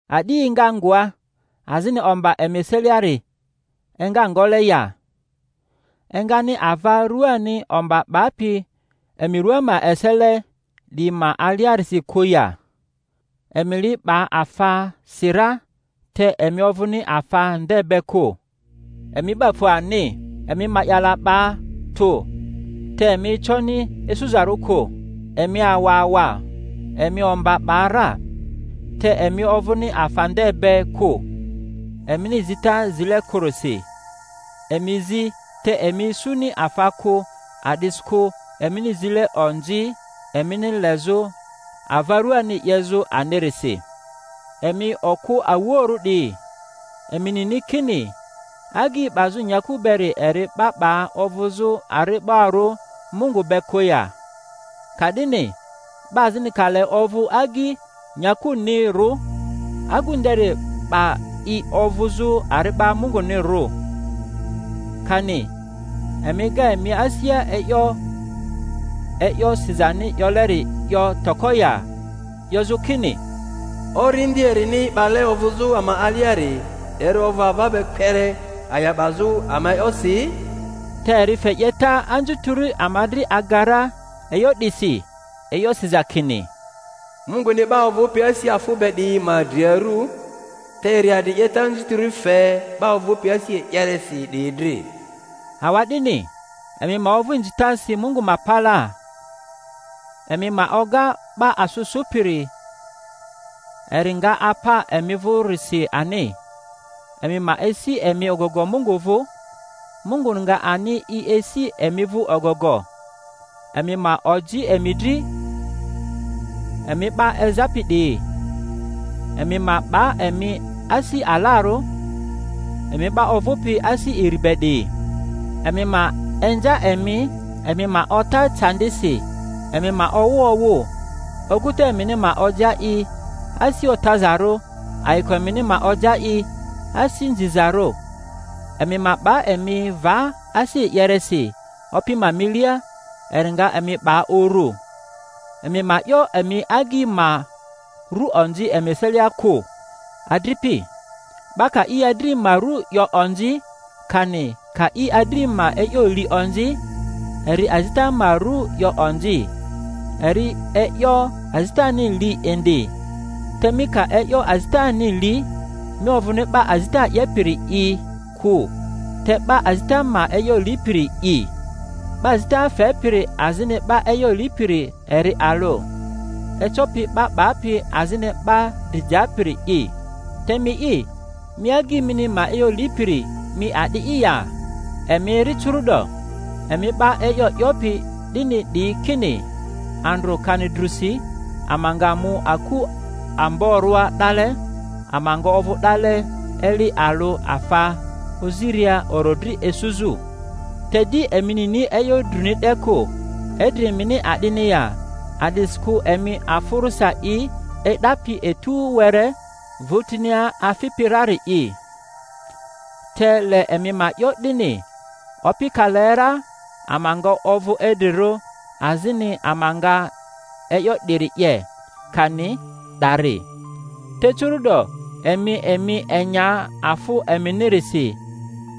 A'di enga ngoa, azini omba emi eseliari enga ngole ya? Engani ava ruani omba 'bapi emi rua ma esele 'diyi ma aliarisi kᴜ ya? Emi li 'ba afasi ra, te emi ovᴜni afa nde be kᴜ; emi 'ba fu ani. Emi ma'yala 'ba tᴜ, te emi econi isuzarᴜ kᴜ; emi awa awa, emi omba 'ba ra. Te emi ovᴜni afa nde be kᴜ, emini zita zile kᴜrisi. Emi zi, te emi isuni afa kᴜ a'disikᴜ emini zile onzi, emini lezᴜ ava ruani 'yezᴜ anirisi. Emi okᴜ awuoᴜrᴜ 'diyi, emi nini kini agyi 'bazᴜ nyaku beri eri 'ba 'ba ovᴜzᴜ ari'barᴜ Mungu be kᴜ ya? Ka'dini 'ba azini ka le ovᴜ agyi nyakunirᴜ, agu nderi 'ba i ovᴜzᴜ ari'ba Mungunirᴜ. Kani emi ega emi asia e'yo e'yo sizani 'yoleri 'yo toko ya, 'yozᴜ kini, Orindi erini 'bale ovᴜzᴜ ama aliari eri ovᴜ ava be kpere a'ya 'bazᴜ ama e'yosi? Te eri fe 'yeta anzutiri ama dri aga ra; e'yo 'disi e'yo siza kini, Munguni 'ba ovᴜpi asi afᴜ be 'diyi ma dri aru, te eri adri 'yeta anzutiri fe 'ba ovᴜpi asi e'yeresi 'diyi dri. Awa'dini emi ma ovᴜ inzitasi Mungu ma palaa; emi ma oga 'ba asᴜ sᴜpiri, eri nga apa emi vᴜrisi ani. Emi ma esi emi ogogo Mungu vᴜ, Munguni nga ani i esi emi vᴜ ogogo. Emi ma oji emi dri, emi 'ba ezapi 'diyi; emi ma 'ba emi asi alarᴜ, emi 'ba ovᴜpi asi iri be 'diyi. Emi ma inza emi, emi ma ota eandisi, emi ma owᴜ awᴜ. Oguta emini ma oja i asi otazarᴜ, ayiko emini ma oja i asi nzizarᴜ. Emi ma 'ba emi va asi e'yeresi Opi ma milia, eri nga emi 'ba uru. Emi ma 'yo emi agyi ma ru onzi emi eselia kᴜ, adripi. 'Ba ka i adri ma ru 'yo onzi, kani ka i adri ma e'yo li onzi, eri azita ma ru 'yo onzi, eri e'yo azitani li indi. Te mi ka e'yo azitani li, mi ovᴜni 'ba azita 'yepiri'i kᴜ, te 'ba azita ma e'yo lipiri’i. 'Ba azita fepiri azini 'ba e'yo lipiri eri alᴜ, ecopi 'ba papi azini 'ba dri japiri'i. Te mi'i, mi agyi mini ma e'yo lipiri, mi a'di'i ya? Emi eri curu’do, emi 'ba e'yo 'yopi 'dini 'diyi, kini, Andrᴜ kani drusi ama nga mu aku amborᴜa 'dale, ama nga ovᴜ 'dale eli alᴜ afa oziria orodri isuzᴜ; te di emi nini e'yo druni 'de kᴜ. Idri emini a'dini ya? A'disikᴜ emi afᴜrᴜsa i e'dapi etu were, vᴜtinia afipi rari'i. Te le emi ma 'yo 'dini, Opi ka le ra ama nga ovᴜ idrirᴜ, azini ama nga e'yo 'diri 'ye, kani 'dari. Te curu' do emi emi enya afᴜ eminirisi.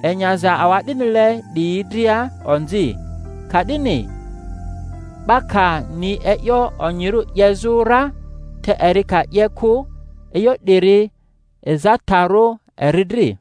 Enyaza awa'dinile 'diyi dria onzi. Ka'dini 'ba ka ni e'yo onyirᴜ 'yezᴜ ra, te eri ka 'ye kᴜ, e'yo 'diri ezataro eri dri.